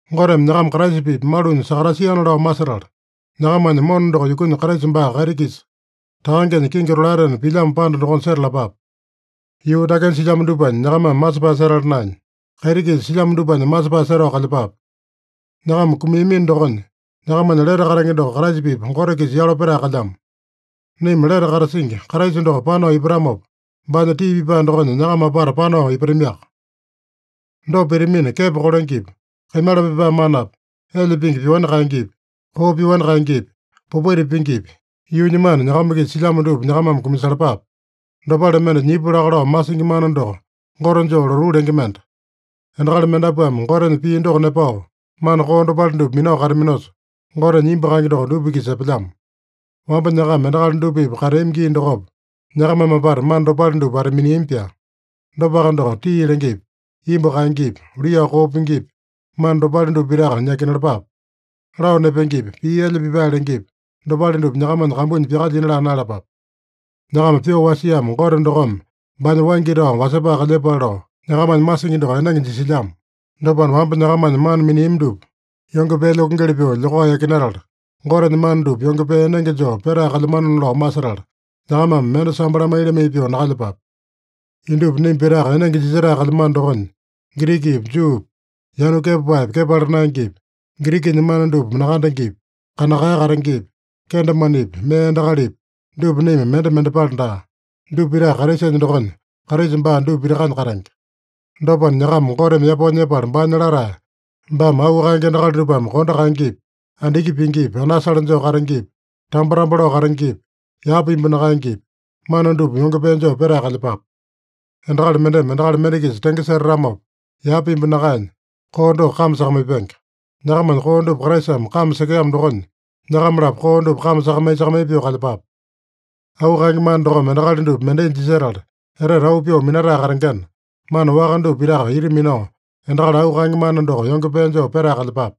Goteme nyakama Kraisa-pipa malunya sakatasiana lao masetala, nyakamanya mona doko yukunya, Kraisa baa kaiti-kisa, Takangenya kingi tolaetena pilyamo panda dokonya setalapape. Yuu dakenya silyamo dupanya nyakamame masepae setala naenya, kaiti-kisa silyamo dupanya masepae setao kalyepape. Nyakama kumiamino dokonya, nyakamanya lete katenge doko Kraisa-pipa Gote-kisa yalo petae kalyamo. Naima lete katasingi, Kraisa doko panao ipatamopa, baanya tii pipae dokonya nyakama apata panao ipatamiaka. Dopa pitamina, kepo kolengepi, kaimala pipae manapi, elya pingi pyoani kaengepi, koo pyoani kaengepi, popaita pingipi, yuunya mana nyakama-kisa silyamo dupa nyakamame kumasalapape. Dopale mende nyipu laka lao masingi mana doko gote joo lotuu lenge mende. Endakali mendapuame Gotenya pii doko nepao, mana koo dopale dupa minao kataminosa, Gotenya imbu kaenge doko dupa-kisa epelyamo. Wamba nyakama endakali dupa-pipa kateami gii dokopa, nyakamame apata mana dopale dupa wata-miniami-pyaa. Dopaka doko, tii lengepi, imbu kaengepi, luiyao koo pingipi, mana dopale dupa pitaka yakinalapape. Lao nepengepi, pii elya pipae lengepi, dopale dupa nyakamanya kambunya pyakalyina laa naeyalapape. Nyakama pyoo wasiamo Gote dokome baanya waingi tao wasepae kalyepale lao, nyakamanya masingi doko enenge jisilyamo. Dopana, wamba nyakamanya mana miniami dupa yonge pee lyokengeli pyoo lyokao yakinatala, Gotenya mana dupa yonge pee enenge joo petae kalyamanona lao masetala, nyakamame mende sambo lamai-lamai pyoo nakalyepape. Indupa naima pitaka enenge jisetae kalyamano dokonya, Girikipi, Juupi, yanu kepapaepi, kepala naengepi, Girikinya mana dupa nakandengepi, kanakae katengepi, kendemanepi, mee endakalipi, dupa naima mende mendepale daa. Dupa pitaka Kraisanya dokonya, Kraisa baa dupa pitakanya katenge. Dopana, nyakama Goteme yapao nyepala baanya latae, baame auu kaenge endakali dupame kondo kaengepi, andiki pingipi, anasale joo katengepi, tambo-tambo lao katengepi, yapa imbu nakaengepi, mana dupa yonge pee joo petae kalyepape. Endakali mendeme endakali mende-kisa tenge setatamopa, yapa imbu nakaenya, koo doko kame sakamaipenge. Nyakamanya koo dupa Kraisame kame sekeamo dokonya, nyakama-lapo koo dupa kame sakamai-sakamai pyoo kalyepape. Auu kaenge mana dokome endakali dupa mendai jisetala, etete auu pyoo minatae katengena, mana waka dupa pitaka ita minao, endakali auu kaenge mana doko yonge pee joo petae kalyepape.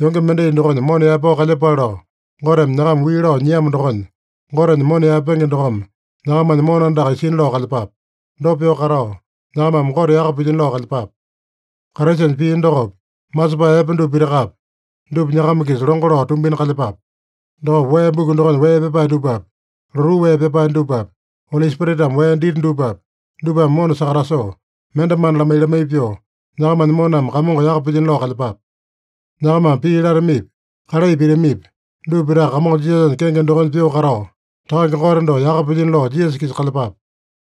Yonge mendai dokonya mona yaepao kalyepale lao Goteme nyakama wii lao nyiamo dokonya, Gotenya mona yaepenge dokome nyakamanya mona andaka isina lao kalyepape. Dopa pyoo katao, nyakamame Gote yaka pilyino lao kalyepape. Kraisanya pii dokopi, masepae epe dupa pitakapi, dupa nyakama-kisa longo lao tumbina kalyepape. Dokopa wee buku dokonya wee pyapae dupapi, lotuu wee pyapae dupapi, Oli Spiritame wee dita dupapi, dupame mona sakatasoo, mende mana lamai-lamai pyoo, nyakamanya moname Kamongo yaka pilyino lao kalyepape. Nyakamame pii latamipi, kalai pitamipi, dupa pitaka Kamongo Jisasanya kenge dokonya pyoo katao, Takange Gote doko yaka pilyino lao Jisasa-kisa kalyepape.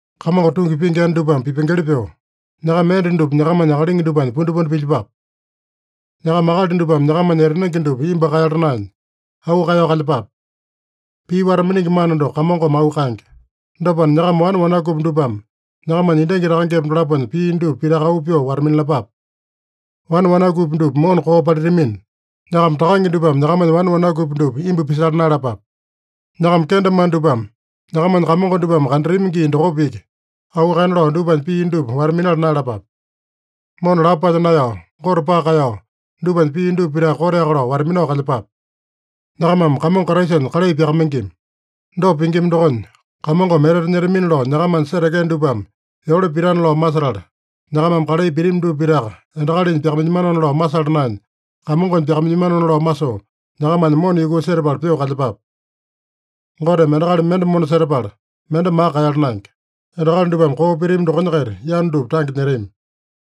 Kamongo tungi pingi enda dupame pipengeli pyoo, nyakama enda dupa nyakamanya akalingi dupanya pundipundi pilyepape. Nyakama akali dupame nyakamanya etanenge dupa imbu kaeyala naenya, auu kaeyao kalyepape. Pii wata-miningi mana doko Kamongome auu kaenge. Dopana, nyakama wane wanakupi dupame nyakamanya endangi takangepa dolaponya pii dupa pitaka auu pyoo wata-minalapape. Wane wanakupi dupa mona koo palitamina, nyakama takange dupame nyakamanya wane wanakupi dupa imbu pisala naeyalapape. Nyakama kendemane dupame nyakamanya kamongo dupame kandatami gii dokopa iki auu kaena lao dupanya pii dupa wata-minala naeyalapape. Mona lapo palya naeyao, Gote paka kaeyao, dupanya pii dupa pitaka koteaka lao wata-minao kalyepape. Nyakamame Kamongo Kraisanya kalai pyakamaingima. Dopa pingima dokonya, Kamongome etete nyetamina lao nyakamanya setekea dupame yole pitana lao masetala, nyakamame kalai pitami dupa pitaka, endakalinya pyakamailyamanona lao masala naenya, Kamongonya pyakamailyamanona lao masoo, nyakamanya mona yukuu setapala pyoo kalyepape. Goteme endakali mende mona setapala, mende maka kaeyala naenge. Endakali dupame koo pitami dokonya-kaita yanu dupa tange nyetami.